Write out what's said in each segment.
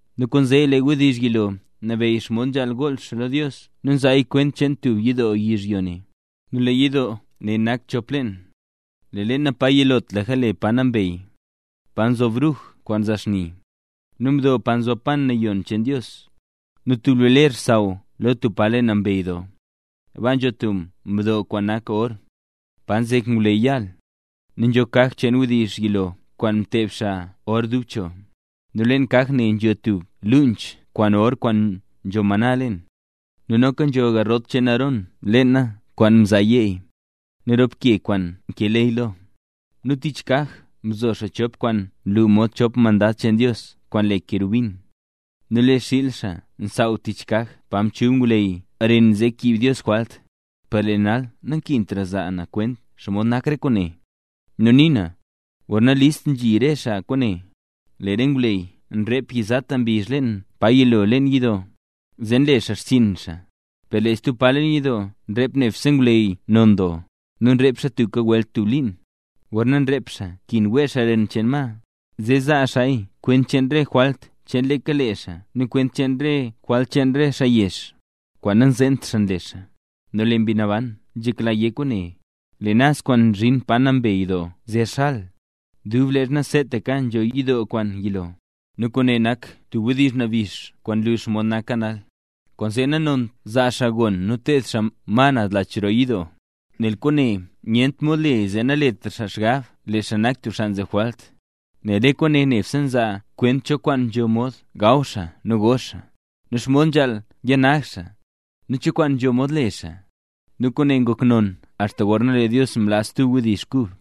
Nu kwaanzee, lee wdizh yilo nabeyy xomod nzhaal gool xaa lo Dios nu nzaaya kwent cheen tub yidoo yizhyo ne. Nu lee yidoo ne nak chop leen; lee leena pa yilotlaka le Pa Nambey, pa nzo bruj kwaan nzaa xni, nu mdo pa nzob pan nayon cheen Dios. Nu tub lee ler nsaaw lo tub pa le Pa Nambey Doo; baa nzho tub mdo kwaan nak or, pa nzek ngwleyy yaal, nu nzho kaj cheen wdizh yilo kwaan mteeb xaa or dub cho. Nu leen kaj ne nzho tub luunch kwaan or kwaan nzho maná leen, nu noka nzho garrot cheen Aarón leena kwaan mzaa yeey, nu rop ke kwaan nkee ley lo. Nu tich kaj mzo xaa chop kwaan nlu mod chop mandad cheen Dios kwaan le kerubin; nu lee xiil xaa nsaaw tich kaj pa nchub ngwleyy ren zee kiib Dios jwalt. Per lee nal nankintra za na kwent xomod nak re kwaane. Nu nii na, gorna list nzhi xaa re kwaane, lee re ngwleyy nrep yizata mbizh leen pa yilo leen yidoo, zee nle xaa xchiin xaa. Per lee stub pa leen yidoo nrep nebse ngwleyy non doo, nu nrep xaa tubka welt tub liin; gorna nrep xaa nkin wee xaa ren cheen ma, zee zaa xaaya kwent cheen re jwalt cheen leeka lee xaa nu kwent cheen re jwalt cheen re xaa yezh, kwaan nanzeent xaa nle xaa. Nu lee Mbi Naban nzhekla yé kwaane: Lee naz kwaan nzhin Pa Nambey Doo zer xal, dub leezha seetaka nzho yidoo kwaan yilo. Nu kwaane nak tub wdizh nabix kwaan nlu xomod naka nal. Kwaanzee nanont zaa xaa gon nu teed xaa ma naz lach roo yidoo, nel kwaane nyent mod le zee naletra xaa xgab lee xaa nak tub xaa nzeb jwalt. Nel re kwaane nebse nzaa kwent cho kwaan nzho mod gaw xaa nu go xaa, nu xomod nzhaal yanag xaa, nu cho kwaan nzho mod le xaa. Nu kwaane ngok non axta gorna lee Dios mlaa stub wdizh kub.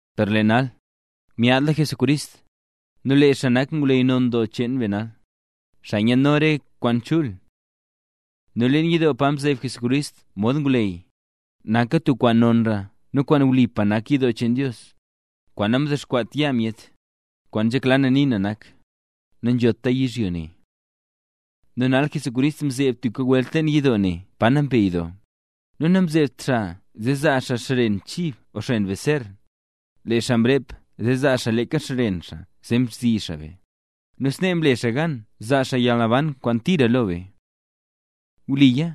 Per lee nal, myaadla Jesucrist, nu lee xaa nak ngwleyy non doo cheen be nal, xaa nyaadno re kwaan chul. Nu leen yidoo pa mzeeb Jesucrist mod ngwleyy, naka tub kwaan nonra nu kwaan wlipa nak yidoo cheen Dios, kwaan namdexkwaat yaa myet; kwaan nzhekla na nii na nak; nanzhota yizhyo ne. Nu nal Jesucrist mzeeb tubka welt leen yidoo Pa Nambey Doo, nu namzeebt xaa zee zaa xaa xren chib o xren beser, lee xaa mrep zee zaa xaa leeka xren xaa zee mzi xaa be, nu snee mle xaa gan zaa xaa yalnaban kwaan tira lo be. Wliya,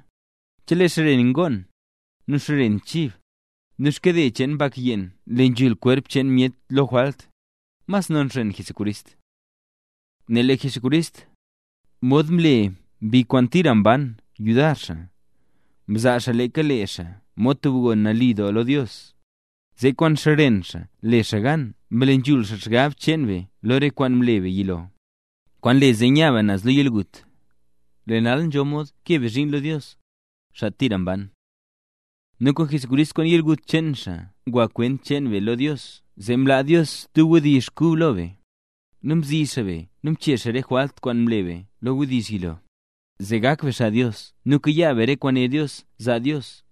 chelee xren ngoon, nu xren chib, nu xkade cheen bak yeen nle nzhul kwerp cheen myet lo jwalt, mas non xren Jesucrist. Nel lee Jesucrist, mod mle Mbi kwaan tira mban yudar xaa, mzaa xaa leeka lee xaa mod tub gon nali doo lo Dios, zee kwaan xren xaa le xaa gan mle nzhul xgab cheen be lo re kwaan mle be yilo, kwaan nle zee nya be naz lo yalgut, lee nal nzho mod kee be zhiin lo Dios, xaa tira mban. Nu Jesucrist kwaan yalgut cheen xaa ngwa kwent cheen be lo Dios zee mlaa Dios stub wdizh kub lo be; nu mzi xaa be nu mchee xaa re jwalt kwaan mle be lo wdizh yilo, zee gak be xaa Dios nu kayaa be re kwaan né Dios zaa Dios,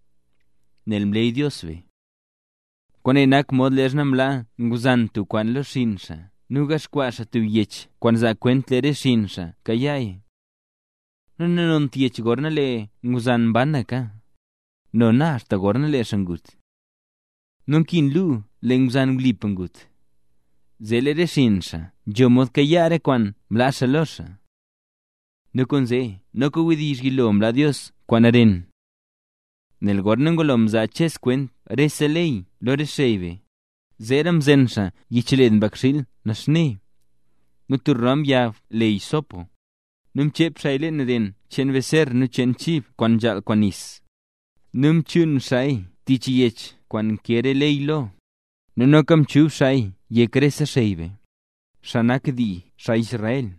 nel mleey Dios be. Kwaane nak mod leezha nlaa ngwzan tub kwaan lo xinn xaa nu ngaxkwaa xaa tub yech kwaan zaa kwent lee re xinn xaa kayaaya. Nu nanont yech gorna lee ngwzan mbanaka, nona axta gorna lee xaa ngut. Nu nkin lu lee ngwzan wlipa ngut, zee lee re xinn xaa nzho mod kayaa re kwaan mlaa xaa lo xaa. Nu kwaanzee noka wdizh yilo mlaa Dios kwaan ren. Nel gorna ngulo mzaa Ches kwent rese ley lo re xey be; zeera mzen xaa yichled mbakxiil naxne, nu tub ram yag le hisopo, nu mchep xaaya lee ren cheen baser nu cheen chib kwaan nzhaal kwaan nis, nu mchuun xaaya tich yech kwaan nkee re ley lo, nu noka mchub xaaya yek rese xey be, xaa nak dii xaa Israel.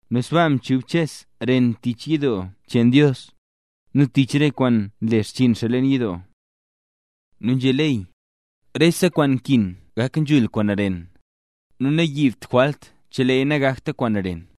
Nu sbaaka mchub Ches ren tich yidoo cheen Dios, nu tich re kwaan nle xchiin xaa leen yidoo. Nu nzhé ley, rese kwaan nkin gak nzhul kwaan ren; nu nayiibt jwalt cheleeya nagakta kwaan ren.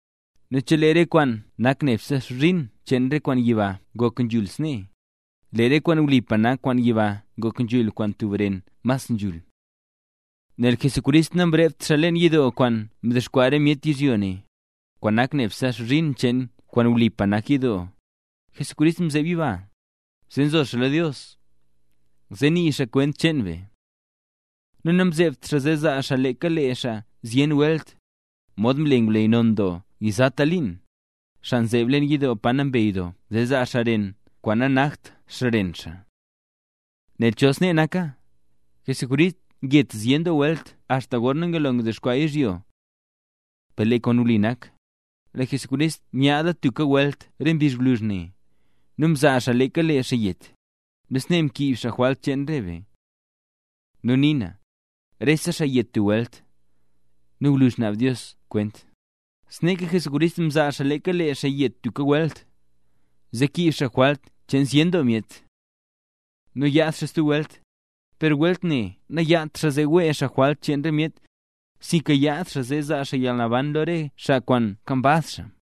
Nu chelee re kwaan nak nebse xbzhin cheen re kwaan yiba ngok nzhul snee, lee re kwaan wlipa nak kwaan yiba ngok nzhul kwaan tub ren mas nzhul. Nel Jesucrist namrept leen yidoo kwaan mdexkwaa re myet yizhyo ne, kwaan nak nebse xbzhin cheen kwaan wlipa nak yidoo; Jesucrist mzeeb yiba, zee zo xaa lo Dios, zee nii xaa kwent cheen be. Nu namzeebt xaa zee zaa xaa leeka lee xaa zyen welt, modxa nle ngwleyy non doo yizata liin, xaa nzeeb leen yidoo Pa Nambey Doo zee zaa xaa ren kwaan nanakt xren xaa. Nel chol snee naka, Jesucrist nget zyen doo welt axta gorna ngulo mdexkwaa yizhyo. Per lee kwaan wli nak, lee Jesucrist myaadla tubka welt re mbizh gwluzh ne, nu mzaa xaa leeka lee xaa yet, nu snee mkiib xaa jwalt cheen re be. Nu nii na, rese xaa yet tub welt, nu gwluzh naab Dios kwent, sneeka Jesucrist mzaa xaa leeka lee xaa yet tubka welt, zee kiib xaa jwalt cheen zyen doo myet. Nu yaad xaa stub welt, per welt ne nayaadt xaa zee wee xaa jwalt cheen re myet, sinka yaad xaa zee zaa xaa yalnaban lo re xaa kwaan nkambaz xaa.